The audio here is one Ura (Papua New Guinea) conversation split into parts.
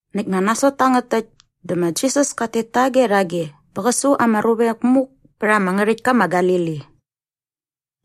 Näkt nga nasot tangät täkt dä ma Jisas kat tet tage rhage bä qä su ama ruvek muk pät ama ngärhäktka ma Galili.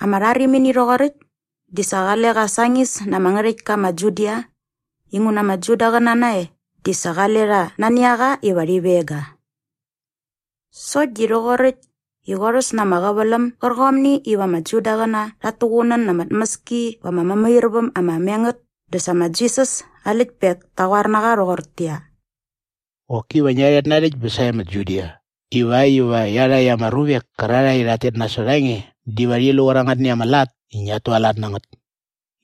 Ama rharimini rhoqoräkt di sa qale qa sañis na ama ngärhäktka ma Judia inguna ama Judaqäna nae di sa qale rha nani a qa iva rhi veng ga. Sokt di rhoqoräkt i qorhäs na ama qäväläm gärqomni iva ama Judaqäna rhat tuqunän na ama tmäski va ama mämairväm ama me ngät dä sa ma Jisas aa läktpek ta qoar na qa rhoqortäqyia, “Qoki va ngia rhet narhäkt bä sae ma Judia iväkt iva iarhakt ama ruvek kärarhae i rhat tet nasot a nge diva rhi lu qärangätni ama lat i ngiat tualat na ngät.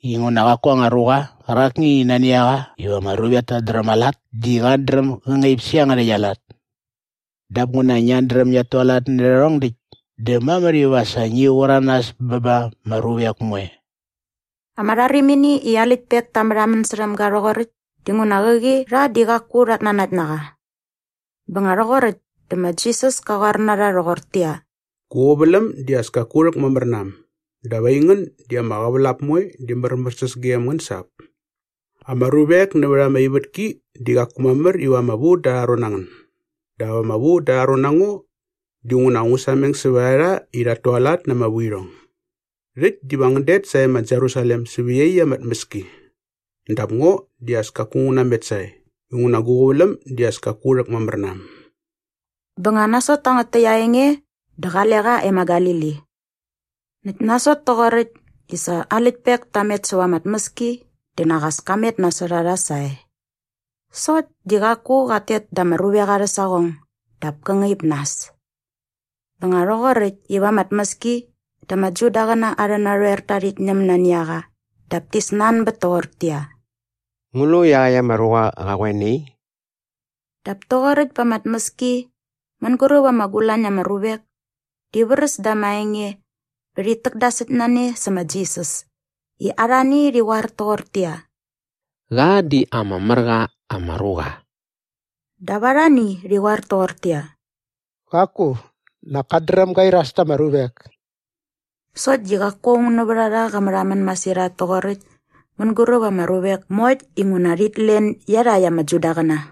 Inguna qaku anga ruqa qärakni i nani a qa iva ama ruvek tat dräm aa lat di qat dräm gä ngaip sä iangärhäkt aa lat. Dap nguna ngiat dräm ngiat tualat nä rhärhong däkt dä mamär iva sa ngi qur a nas bä ba ama ruvek moe.” Ama rharimini i aa läktpek ta märhamän särhäm ga rhoqoräkt dinguna qäqi rha di qaku rhat nanakt na qa. Bä nga rhoqoräkt dä ma Jisas ka qoar na rha rhoqortäqyia, “Gu qäväläm di as kaku rhäkmamär na äm dap aingän di ama qävälap moe di märmärsäs gem ngän sa ap. Ama ruvek nävät ama ivätki di qaku mamär iva ama vu da arha ron na ngän dap ama vu da arha ron na ngo dinguna ngu sameng sävät a rha i rhat tualat na ama vuirhong. Rhäkt diva ngän det sae ma Jerusalem säva iaqyäkt ama tmäski. Dap ngo di as kaku ngu namet sae inguna gu qäväläm di as kaku rhäkmamär na äm.” Bä nga nasot tangät täkt aa enge dä qale qa e ma Galili. Näkt nasot toqoräkt i sa aa läktpek ta met säva ama tmäski dä nak as ka met nasot a rha sae. Sokt di qaku qat tet da ama ruvek arhä saqong dap kä ngaip nas. Bä nga rhoqoräkt iva ama tmäski dä ama Judaqäna arhä narhoerta rhit ñäm nani a qa dap ti snanbät toqortäqyia, “Ngu lu iaqäkt ama ruqa qa qoe nai?” Dap toqoräkt pa ama tmäski mänguräp ama gulañ na ama ruvek di vräs da ama enge bä rhit täkdasäkt na ne sä ma Jisas i arhani rhi qoar toqortäqyia, “Qa di ama mär qa ama ruqa.” Dap arhani rhi qoar toqortäqyia, “Qaku, nak kat dräm ga iras ta ama ruvek.” Sokt di qaku aung nävät a rha qa märhamän masirhat toqoräkt mänguräp ama ruvek moekt inguna rhit len iarhakt ama Judaqäna.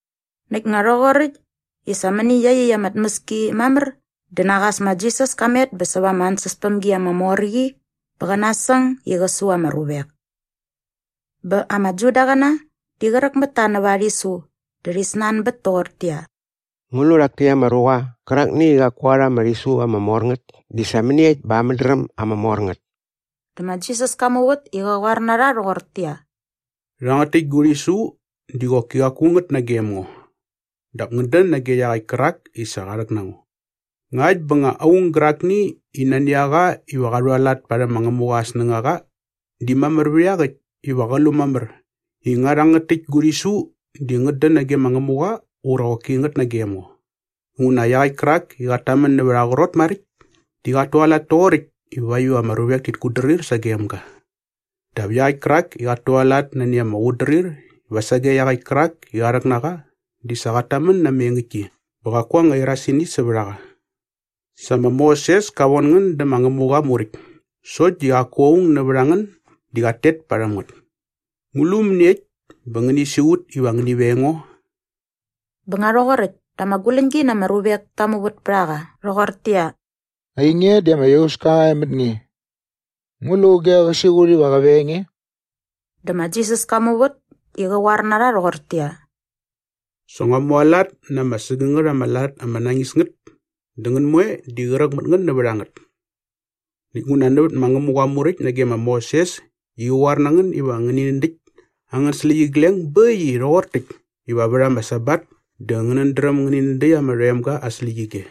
Näkt nga rhoqoräkt i sa mäni iaqyäkt ama tmäski mamär dä nak as ma Jisas ka met bä säva ama ansäspämgi ama mor qi bä qä nasäng i qä su ama ruvek. Bä ama Judaqäna di qräk mät ta nävät aa rhisu dä rhi snanbät toqortäqyia, “Ngu lu rhak täkt ama ruqa qärakni i qaku qa rha ama rhisu ama mor ngät di sa mäniekt bä aa mädräm ama mor ngät?” Dä ma Jisas ka muvät i qä qoar na rha rhoqortäqyia, “Rhangät täkt gu rhisu di qoki qaku ngät nagem ngo. Dap ngät dän nage iaqäkt kärak i sa qa rhäk na ngo. Ngakt bä nga aung gärakni i nani a qa iva qa rhualat parhäm ma Ngämuqa aa snängaqa di mamär vät iaqäkt iva qä lu mamär i nga rhangät täkt gu rhisu di ngät dän nage ma Ngämuqa ura qoki ngät nagem ngo. Inguna iaqäkt kärak i qat tamän nävät aa qrot maräkt di qat tualat toqoräkt ivakt iva ama ruvek tit kutdrir sagem ga. Dap iaqäkt kärak i qat tualat nani ama qutdrir iva sage iaqäkt kärak i qa rhäk na qa di sa qat tamän na ama engäktki bä qaku anga irasini sävät a qa. Sa ma Moses ka von ngän dä ma Ngämuqa aa Muräkt sokt di qaku aung nävät angän di qat tet parhäm ngät. Ngu lu mäniekt bä ngäni siqut iva ngäni veng ngo?” Bä nga rhoqoräkt dä ama guläñgi na ama ruvek ta muvät pät a qa rhoqortäqyia, “Ainge di ama iauska qa e mät nge. Ngu lu auge qä siqut iva qä veng nge?” Dä ma Jisas ka muvät i qä qoar na rha rhoqortäqyia, “Sa ngua mualat na ama sägängät ama lat ama nañis ngät dä ngän moe di qräk mät ngän nävät a ngät. Näkt nguna nävät ma Ngämuqa aa Muräkt nage ma Moses i qa qoar na ngän iva ngäni nädäkt angän släqyigleng bä äkt i rhoqor täkt iva vät ama Sabat dä ngänät dräm ngäni nädäkt ama rhoemga aa släqyige.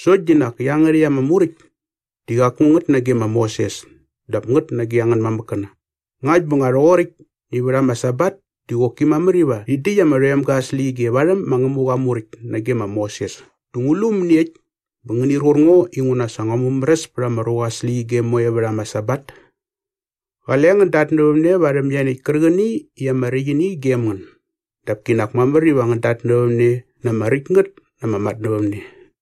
Sokt di nak iangärhäkt ama Muräkt di qaku ngät nage ma Moses dap ngät nage angän mamäkkäna. Ngakt bä nga rhoqoräkt i vät ama Sabat di qoki mamär iva rhi däkt ama rhoemga aa släqyige varhäm ma Ngämuqa aa Muräkt nage ma Moses dä ngu lu mäniekt bä ngänir qur ngo inguna sa ngua mumäräs pät ama ruqa aa släqyige moe vät ama Sabat? Qale ngän datnävämne varhäm ianiäkt kärqäni i ama räkt ini gem ngän dap kinak mamär iva ngän datnävämne na ama räkt ngät ama matnävämne.”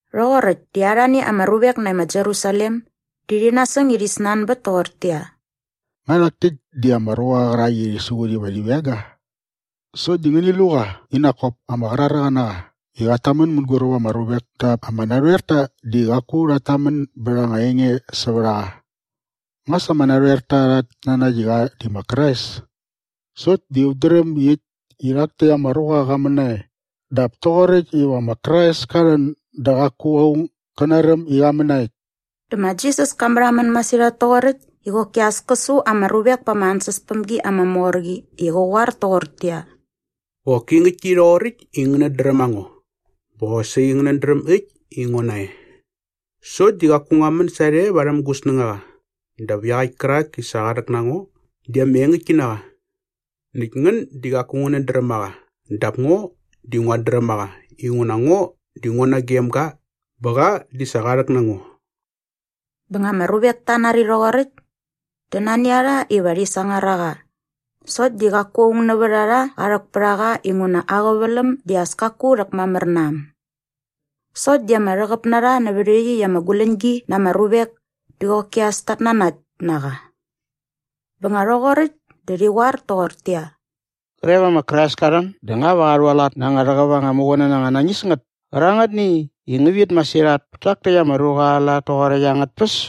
Rhoqoräkt di arhani ama ruvek nae ma Jerusalem di rhi nasäng i rhi snanbät toqortäqyia, “Nga rhak täkt di ama ruqa qärak i rhi siqut iva rhi veng ga? Sokt di ngäni lu qa i nak kop ama qraräqa na qa i qat tamän mänguräp ama ruvek dap ama narhoerta di qaku rhat tamän bät anga enge sävät a qa. Nga sa ama narhoerta rhat nanakt i qa di ma Krais? Sokt di ut dräm äkt i rhak täkt ama ruqa qa män nae dap toqoräkt iva ma Krais ka rhän dä qaku aung gä naräm i qa män na äkt.” Dä ma Jisas ka märhamän masirhat toqoräkt i qoki as kä su ama ruvek pa ama ansäspämgi ama mor qi i qä qoar toqortäqyia, “Qoki ngäktki rhoqoräkt i ngänät dräm a ngo bä qosaqi ngänät dräm äkt i ngo nae. Sokt di qaku ngua män sarhe varhäm gu snängaqa dap iaqäkt kärak i sa qa rhäk na ngo di ama engäktki na qa. Näkt ngän di qaku ngänät dräm a qa dap ngo di nguat dräm a qa inguna ngo di ngo nagem ga bä qa di sa qa rhäk na ngo.” Bä nga ama ruvek ta nari rhoqoräkt dä nani a rha iva rhi sangar a qa sokt di qaku aung nävät a rha qa rhäk pät a qa inguna aa qäväläm di sa as kaku rhäkmamär na äm. Sokt di ama rhäqäp na rha nävät iaqyäkt ama guläñgi na ama ruvek di qoki as ta nanakt na qa. Bä nga rhoqoräkt dä rhi qoar toqortäqyia, “Qre va ma Krais ka rhän dä nga va qa rhualat na anga rhäqäp anga muqunän anga nañis ngät kärangätni i ngä vit masirhat pät tak täkt ama ruqa aa lat toqoräkt angät tpäs?”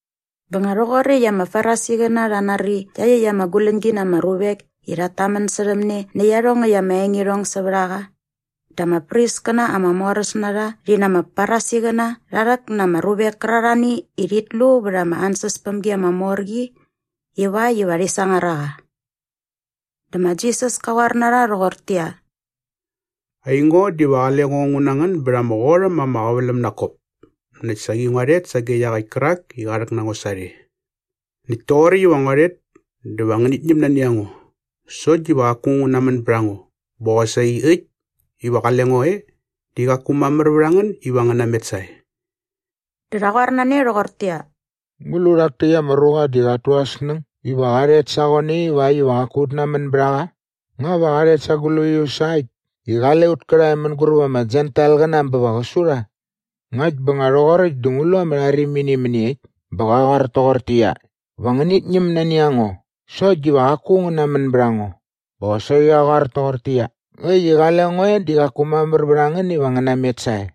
Bä nga rhoqoräkt i ama Farisiqäna rha nari iaqyäkt ama guläñgi na ama ruvek i rhat tamän särhäm ne nä iarhongäkt ama engirhong sävät a qa dä ama priskäna ama moräs na rha rhi na ama Farisiqäna rha rhäk na ama ruvek kärarhani i rhit lu vät ama ansäspämgi ama mor qi ivakt iva rhi sangar a qa. Dä ma Jisas ka qoar na rha rhoqortäqyia, “Aingo diva qale ngo ngu na ngän bät ama qot äm ama qäväläm nak kop näkt saqi ngua rhet sage iaqäkt kärak i qa rhäk na ngo sarhe. Näkt toqoräkt iva ngua rhet dä va ngänit ñäm nani a ngo sokt diva qaku ngän namän bät a ngo bä qosaqi äkt iva qale ngo e di qaku mamär vät a ngän iva ngän namet sae.” Dä rha qoar na ne rhoqortäqyia, “Ngu lu rhak täkt ama ruqa di qat tu aa snäng iva qa rhet sa qoe nai ivakt iva qaku ut namän bät a qa? Nga va qa rhet sa gläius sa äkt i qale ut kärhae mänguräp ama Jentailqäna bä va qä su rha? Ngakt bä nga rhoqoräkt dä ngu lu ama rharimini mäniekt bä qa qoar toqortäqyia, ‘Va ngänit ñäm nani a ngo sokt diva qaku ngän namän bät a ngo’ bä qosaqi qa qoar toqortäqyia, ‘Äkt i qale ngo e di qaku mamär vät a ngän iva ngän namet sae’?”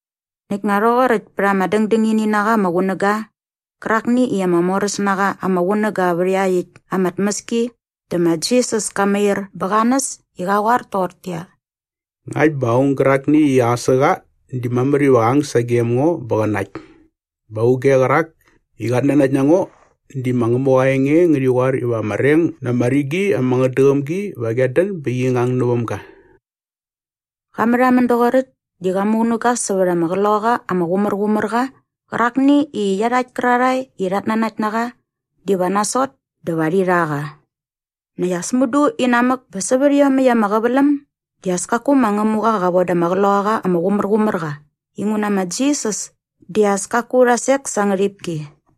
Näkt nga rhoqoräkt pät ama dängdängini na qa ama qunäga qärakni i ama moräs na qa ama qunäga vät iaqyäkt ama tmäski dä ma Jisas ka mair bä qa näs i qa qoar toqortäqyia, “Ngakt bä aung gärakni i aqäsä qa di mamär iva qä ang sagem ngo bä qä nakt. Bä auge qärak i qat nanakt na ngo di ma Ngämuqa aa enge ngärhi qoar iva ama reng na ama rigi ama ngätdäqäm gi va qiat dän bä qi ngang näväm ga.” Qa märhamän doqoräkt di qa muqunäga sävät ama Qloqaqa ama Qumärqumärqa qärakni i iarhakt kärarhae i rhat nanakt na qa diva nasot dä va rhi rha qa. Näkt as mudu inamäk bä sävät iomäkt ama qäväläm di as kaku ma Ngämuqa qa von da ama Qloqaqa ama Qumärqumärqa inguna ma Jisas di as kaku rha sek sa aa ngärhipki.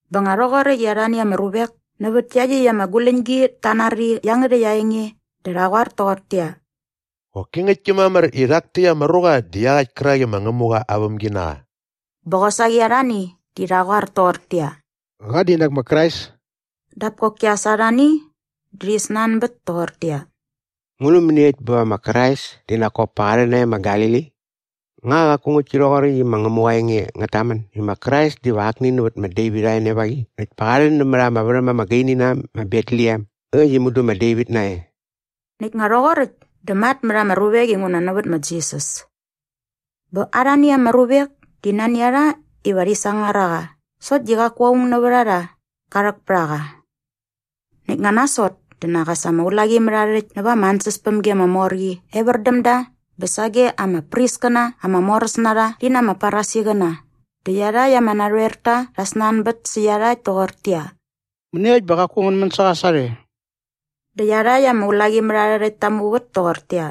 Bä nga rhoqoräkt i arhani ama ruvek nävät iaqyäkt ama guläñgi ta nari iangärhäkt aa enge dä rha qoar toqortäqyia, “Qoki ngäktki mamär i rhak täkt ama ruqa di iaqäkt kärak i ma Ngämuqa aa vämginaqa.” Bä qosaqi arhani di rha qoar toqortäqyia, “Qa di nak ma Krais.” Dap koki as arhani di rhi snanbät toqortäqyia, “Ngu lu mäniekt bä va ma Krais di nak kop pa qa rhän nae ma Galili? Nga qaku ngäktki rhoqoräkt i ma Ngämuqa aa enge ngät tamän i ma Krais diva akni nävät ma Devit aa enevaqi näkt pa qa rhän nämät ama värhäm ama gaini na äm ma Betlehem äkt i mudu ma Devit nae?” Näkt nga rhoqoräkt dä matmät ama ruvek inguna nävät ma Jisas. Bä arhani ama ruvek di nani a rha iva rhi sangar a qa sokt di qaku aung nävät a rha qa rhäk pät a qa. Näkt nga nasot dä nak as ama ulaqimärharhärhäkt näva ama ansäspämgi ama mor qi evär däm da bä sage ama priskäna ama moräs na rha rhi na ama Farisiqäna dä iarhakt ama narhoerta rha snanbät sä iarhakt toqortäqyia, “Mäniekt bä qaku ngän män sä qa sarhe?” Dä iarhakt ama ulaqimärharhärhäkt ta muvät toqortäqyia,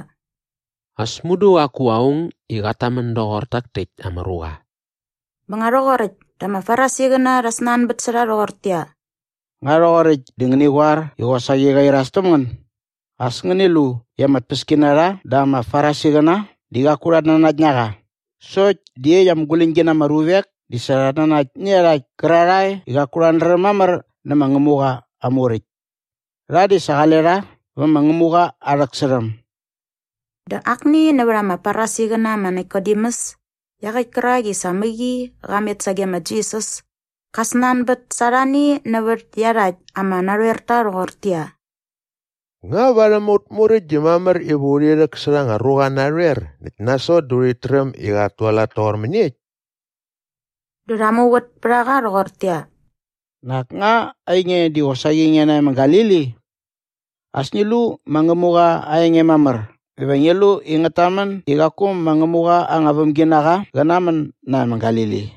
“As mudu qaku aung i qat tamän doqor tak täkt ama ruqa.” Bä nga rhoqoräkt dä ama Farisiqäna rha snanbät sä rha rhoqortäqyia, “Nga rhoqoräkt di ngäni qoar i qosaqi qa iras täm ngän? As ngäni lu i ama tpäskinarha dä ama Farisiqäna di qaku rhat nanakt na qa. Sokt di iaqyäkt ama guläñgi na ama ruvek di sa rhat nanakt iarhakt kärarhae i qaku rhat dräm mamär nä ma Ngämuqa aa Muräkt. Rha di sa qale rha vä ma Ngämuqa aa rhäksärhäm.” Dä akni nävät ama Farisiqäna ma Nikodemus iaqäkt kärak i sa mäqi qa met sage ma Jisas ka snanbät sa arhani nävät iarhakt ama narhoerta rhoqortäqyia, “Nga varhäm aut muräkt di mamär iva urhi rhäksärha anga ruqa narhoer näkt nasot dä urhit träm i qat tualat toqor mäniekt?” Dä rha muvät pät a qa rhoqortäqyia, “Nak nga ainge di qosaqi nge nae ma Galili? As ngi lu ma Ngämuqa aa enge mamär dä va ngi lu i ngät tamän i qaku ma Ngämuqa anga vämginaqa qä namän nae ma Galili.”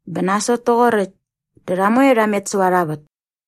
[Bä nasot toqoräkt dä rha moe rha met säva arha vät